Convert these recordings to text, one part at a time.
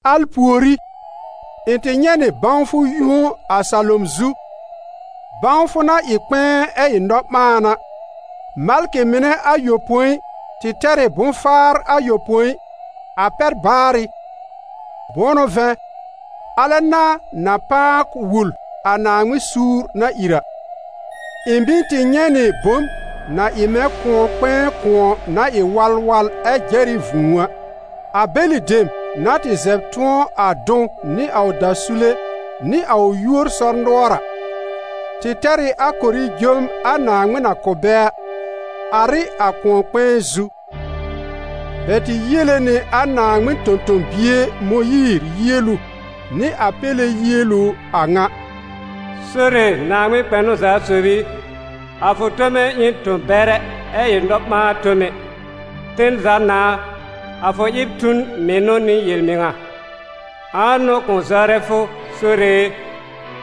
Al pùorí, ɩ̃ tɩ nyɛ̃ nɩ bãwfʋ yũo a salom zu, bãwfʋ na ɩ kpɛ̃ɛ ɛ ɩ nɔ-ɓãan a: malkɩ mɩnɛ ayopõi tɩ tɛr ɩ bʋ̃-faar ayopõi, a pɛr-baarɩ; bʋ̃ʋ n'ʋ vɛ̃, alɛ n'a na pãa wul a Naaŋmɩn suur na ìr a. Ɩ̃ mɩ̀ tɩ nyɛ̃ nɩ bom na ɩ mɛ̃ kʋ̃ɔ-kpɛ̃ɛ kʋ̃ɔ na ɩ walwal ɛ jɛr ɩ vũu a. A bɛlɩ dem, na tɩ zɛb tʋ̃ɔ a dʋ̃w nɩ a ʋ dasule nɩ a ʋ yúor sɔr-nʋɔr a, tɩ tɛr ɩ a korijom a Naaŋmɩn na kʋ̀ bɛ a, ar ɩ a kʋ̃ɔ-kpɛ̃ɛ zu. Bɛ tɩ yiele nɩ a Naaŋmɩn tõ-tõ-bie Mõyiir yielu, nɩ a Péle yielu a ŋa: «Sore Naaŋmɩn kpɛnʋ-za-sob i, a fʋ tome ɩ n tõ-bɛrɛ ɛ ɩ nɔ-ɓãa-tome. Ten za Nãà a, a fʋ ɩb tu n mɩnʋ nɩ yel-mɩŋa. Ãa n'ʋ kʋ̃ zɔrɛ fʋ, Sore e,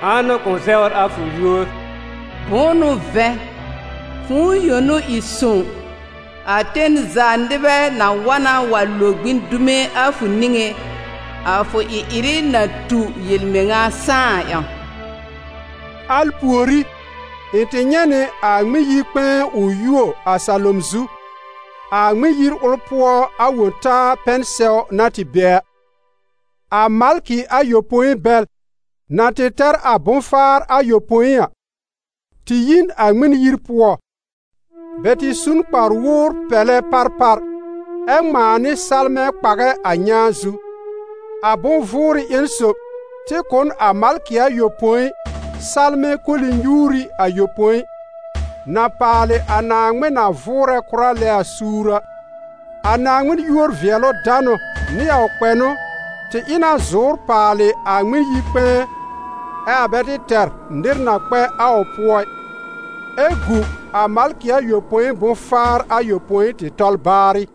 ãa n'ʋ kʋ̃ zɛwr a fʋ yúor? Bʋ̃ʋ n'ʋ vɛ̃, fʋ̃ʋ yõ n'ʋ ɩ sõw, a ten za nɩbɛ na wa na wa lo gbĩ dume a fʋ niŋé, a fʋ ɩ-ɩrɩ na tu yel-mɩŋa sãá a ƴãw.» Al pùorí, ɩ̃ tɩ nyɛ̃ nɩ a Ŋmɩn-yi-kpɛ̃ɛ ʋ yuo a salom zu, a Ŋmɩn-yir ʋl pʋɔ a Wõ-taa pɛn-sɛw na tɩ be a. A malkɩ ayopõi bɛl, na tɩ tɛr a bʋ̃-faar ayopõi a, tɩ yi n a Ŋmɩn-yir pʋɔ; bɛ tɩ su n kpar-wowr-pɛlɛ parpar ɛ ŋmãa nɩ salmɛ̃ kpàgɛ́ a nyãa zu. A bʋ̃-vʋʋrɩ ƴẽn sob tɩ kʋ̀ n a malkɩ ayopõi salmɛ̃ koli-nyuuri ayopõi, na paalɩ a Naaŋmɩn na vʋʋrɛ kʋra lɛ a suur a. A Naaŋmɩn yúor-vɩɛlʋ-danʋ nɩ a ʋ kpɛnʋ tɩ ɩ na zʋ̀ʋ́r paalɩ a Ŋmɩn-yi-kpɛ̃ɛ, ɛ a bɛ tɩ tɛr nɩr na kpɛ a ʋ pʋɔ ɩ, ɛ gu a malkɩ ayopõi bʋ̃-faar ayopõi tɩ tɔl baarɩ.